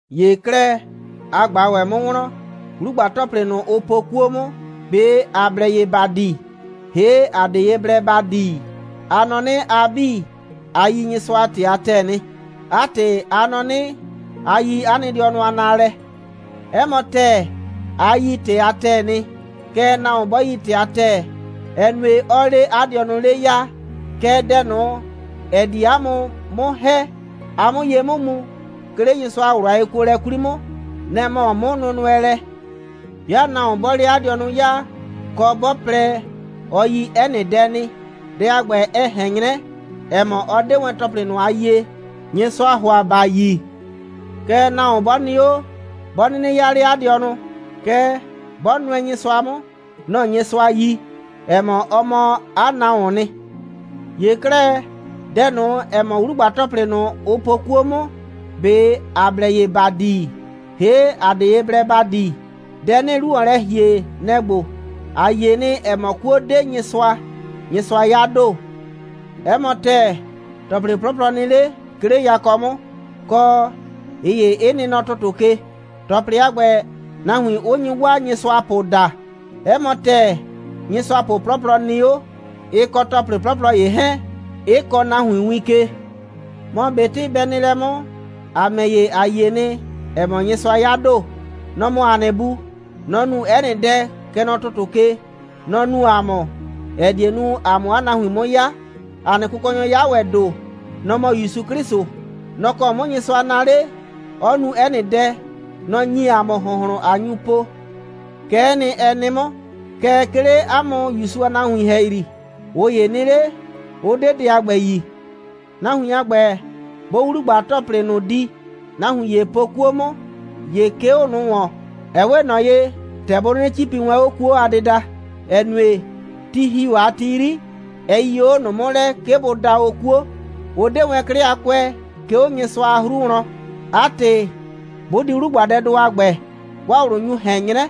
‑Ye 'klɛɛ, a ꞊gba ‑wɛ 'mʋ wlɔn: 'Wlugba‑tɔplɩ ꞊nʋ, ʋ po 'kuo 'mʋ, ꞊be ‑a blɛ ye ‑ba di, ‑hee' ‑a 'de ye blɛ ‑ba di? A nɔ 'nɩ, a 'bii, a yi Nyɩsʋa a ‑tɩ a ‑tɛɛ nɩ. 'A ‑tɩ, a nɔ 'nɩ, a yi 'a nɩ dɩɔnʋ a naalɛ. 'Ɛ mɔ ‑tɛɛ, a yi ‑tɩ a ‑tɛɛ nɩ. Kɛɛ, nahuon 'bɔ yi ‑tɩ a ‑tɛɛ, ɛ nue, 'ɔɔ 'le 'a dɩɔnʋ 'le 'yaa. Kɛɛ, dɛ ꞊nʋ, ‑ɛ di ‑a mʋ 'mʋ ‑hɛ, ‑a 'mʋ ye 'mʋ mu, 'ke 'le Nyɩsʋa a ꞊wlʋ a yekuolɛ 'kwli 'mʋ, nɛ‑ mɔ 'mʋnʋnʋɛlɛ. 'Bɩa nahuon 'bɔɔ 'le 'a dɩɔnʋ 'yaa, kɔ, 'bɔ plɛ, ɔ yi 'ɛ nɩ dɛ nɩ, dɛ a ‑gbɛ, ɛ ꞊hɛn 'nyrɛ, ‑ɛ mɔ, ɔ 'de wɛn ‑tɔplɩ ꞊nʋ a yie, Nyɩsʋaa ‑hʋa, ‑ba yi. Kɛɛ, nahuon 'bɔ nɩ 'o, 'bɔ 'nɩnɩ 'yaa 'le 'a dɩɔnʋ, kɛɛ, 'bɔ nʋɛ Nyɩsʋa 'mʋ, nɔ‑ Nyɩsʋa yi, ‑ɛ mɔ, ɔ mɔ 'a nahuoon nɩ. ‑Ye 'klɛɛ, dɛ ꞊nʋ, ‑ɛ mɔ 'wlugba‑tɔplɩ ꞊nʋ, ʋ po 'kuo 'mʋ, ꞊be ‑a blɛ ye ‑ba di, ‑hee' ‑a 'de ye blɛ ‑ba di? Dɛ 'nɩɩ 'lu ‑wɔn lɛ ‑hie, nɛ‑ ‑gbo: ‑A yie nɩ, ‑ɛ mɔ, 'kuo 'de Nyɩsʋa. Nyɩsʋa 'ya ‑do. 'Ɛ mɔ ‑tɛɛ, ‑tɔplɩ 'plɔplɔ nɩ 'le, 'ke 'le yakɔ 'mʋ, kɔ, ꞊ɩ ‑ye 'ɩ nɩ nɔ ‑tʋtʋ ke, ‑tɔplɩ a ‑gbɛ, nahuin 'ʋ nyi 'waa nyɩsʋapʋ daa. 'Ɛ mɔ ‑tɛɛ, nyɩsʋapʋ 'plɔplɔ nɩ 'o, ɩ kɔ ‑tɔplɩ 'plɔplɔ ‑ye 'hɛɛn, 'ɩ kɔɔ nahuin win ke. Mɔ ꞊betɩ bɛ nɩ lɛ 'mʋ, ‑a ‑mɛ ‑ye, ‑a yie nɩ, ‑ɛ mɔ, Nyɩsʋa 'ya ‑do. Nɔ‑ mɔ ‑a nɩ Bu. Nɔ‑ nu 'ɛ nɩ dɛ, kɛ nɔ ‑tʋtʋ ke. Nɔ‑ nu ‑a mʋ, ‑ɛ die nu, ‑a 'mʋ 'a nahuin 'mʋ 'ya. ‑A nɩ Kʋkɔnyɔ 'ya ‑wɛ ‑do. Nɔ‑ mɔ ‑Yusu 'Klɩsʋ. Nɔ‑ kɔ 'mʋ Nyɩsʋa naa 'le, 'ɔ nu 'ɛ nɩ dɛ. Nɔ‑ ‑nyi ‑a mʋ ‑hʋnhlʋn, ꞊a nyu po. Kɛ'ɛ nɩ, ɛ nɩ 'mʋ. Kɛɛ, 'ke 'le 'a mʋ ‑Yusu a nahuin ‑hɛyri, ꞊ʋ ‑ye nɩ 'le, 'ʋ 'de dɛ a ‑gbɛ yi. Nahuin a ‑gbɛ, 'bʋʋ 'wlugba‑tɔplɩ ꞊nʋ di, nahuin ‑ye po 'kuo 'mʋ, ‑ye 'ke 'o ꞊nʋ ‑wɔn, ɛ 'we ꞊nɔ ‑tɛ bʋ 'nɩnɩ 'cipi wɛn 'o 'kuo a dɩda, ‑ɛ nue, ti ‑hi o a ti 'yri, ɛ yii o 'o ꞊nʋ 'mʋ lɛ, 'ke bʋ da o 'kuo. Ʋ 'de wɛn 'klɩ a kʋɛ, 'ke 'o Nyɩsʋa a 'hru wlɔn. 'A ‑tɩ, 'bʋ di 'wlugbadɛdʋ a ‑gbɛ, 'waa ꞊wlʋ nyu ꞊hɛn 'nyrɛ,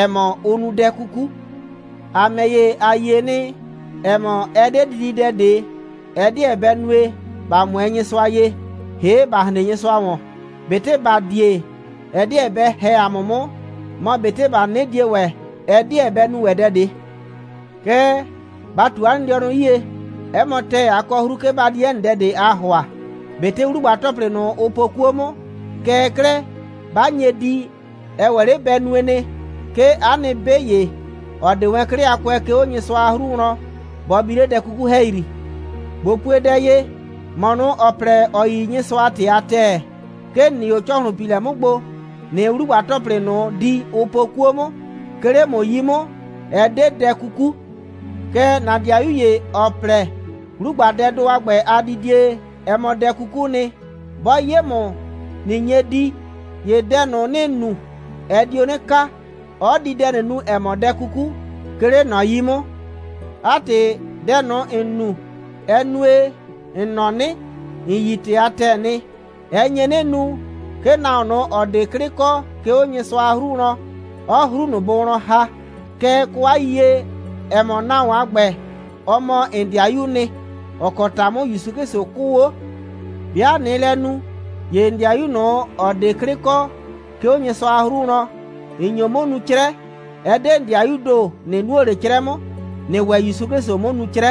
‑ɛ mɔ, ʋ nu dɛ 'kuku. ‑A ‑mɛ ‑ye, ‑a yie nɩ, ‑ɛ mɔ, ɛ 'de dididɛ ꞊de, ɛ 'deɛ bɛ nue, ‑ba 'mʋɛɛ Nyɩsʋa ye, ‑hee' ‑ba hren Nyɩsʋa ‑wɔn. ꞊Betɩ ‑ba die, ɛ 'deɛ bɛ ‑hɛ ‑a mʋ 'mʋ, mɔ, ꞊betɩ ‑ba 'nɩnɩ die ‑wɛ, ɛ 'deɛ bɛ nu ‑wɛ dɛ ꞊de. Kɛɛ, ba ꞊tu 'a nɩ dɩɔnʋ 'yie. 'Ɛ mɔ ‑tɛɛ, a kɔ 'hru, 'ke ba di 'ɛ nɩ dɛ ꞊de, aa ‑hʋa, ꞊betɩ 'wlugba‑tɔplɩ ꞊nʋ, ʋ po 'kuo 'mʋ. Kɛɛ 'klɛɛ, 'ba nye di, ɛ ‑wɛ 'le bɛ nue nɩ, 'ke 'a nɩ 'be ‑ye, ‑ɔ 'de wɛn 'klɩ a kʋɛ, 'ke 'o Nyɩsʋa a 'hru wlɔn, bɔ bi 'le dɛ 'kuku ‑hɛyri. ꞊Bo pue dɛ ye: ‑Mɔ ꞊nʋ, ‑ɔ plɛ, ‑ɔ yi Nyɩsʋa a ‑tɩ a ‑tɛɛ, 'ke ‑n nɩ 'o ‑cɔhlʋnpiilɛ 'mʋ gbo, ꞊nɩɩ 'wlugba‑tɔplɩ ꞊nʋ di, ʋ po 'kuo 'mʋ, 'ke 'le ‑mʋ 'yi 'mʋ, ɛ 'de dɛ 'kuku. Kɛɛ, ‑na ‑dɩayu ‑ye, ‑ɔ plɛ, 'wlugbadɛdʋ a ‑gbɛ a didie, ɛ mɔ dɛ 'kukuu nɩ, 'bɔ 'ye ‑mʋ, ꞊nɩ nye di, ‑ye dɛ ꞊nʋ, ‑nɩɩ nu, ɛ dio 'nɩ kaa, 'ɔ di dɛ ꞊nʋ nu, ‑ɛ mɔ dɛ 'kuku, 'ke 'le ꞊nɔ 'yi 'mʋ. 'A ‑tɩ, dɛ ꞊nʋ, ‑n nu, ‑ɛ nue, ‑n nɔ 'nɩ, ‑n yi ‑tɩ a ‑tɛɛ nɩ, ɛ nye 'nɩ nu, 'ke nahuon ꞊nʋ, ‑ɔ 'de 'klɩ kɔ, 'ke 'o Nyɩsʋa a 'hru wlɔn, 'ɔɔ 'hru ꞊nʋ bʋ wlɔn ‑ha. Kɛɛ, kɔ 'a yiyie, ‑ɛ mɔ, nahuon a ‑gbɛ, ɔ mɔ ‑n ‑dɩayuu nɩ, ‑ɔ kɔ ‑ta 'mʋ ‑Yusu 'Klɩsʋ 'kʋʋ 'o. 'Bɩa ꞊nɩɩ lɛ nu, ‑ye ‑n ‑dɩayu ꞊nʋ, ‑ɔ 'de 'klɩ kɔ, 'ke 'o Nyɩsʋa a 'hru wlɔn, ‑n nyo 'mʋ nu 'crɛ. Ɛ 'de ‑n ‑dɩayuu ‑do, ꞊nɩ nuo ꞊le 'crɛ 'mʋ, ‑nɩɩ ‑wɛ ‑Yusu 'Klɩsʋ 'mʋ nu 'crɛ.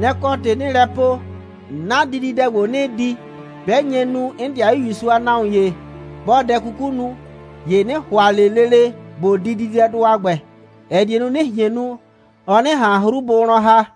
Nɛ‑ kɔ ‑tɩ 'nɩɩ lɛ po, 'na dididɛ ‑gbo, 'nɩɩ di, 'bɛ nye nu, 'n ‑dɩayu ‑Yusu a nahuon ‑ye 'bɔɔ dɛ 'kuku nu, ‑ye 'nɩ ‑hʋa ꞊le lele ꞊bo di dididɛdʋ a ‑gbɛ, ‑ɛ die nu, 'nɩ ꞊hien nu, ɔ 'nɩ ꞊han 'hru bʋ wlɔn ‑ha.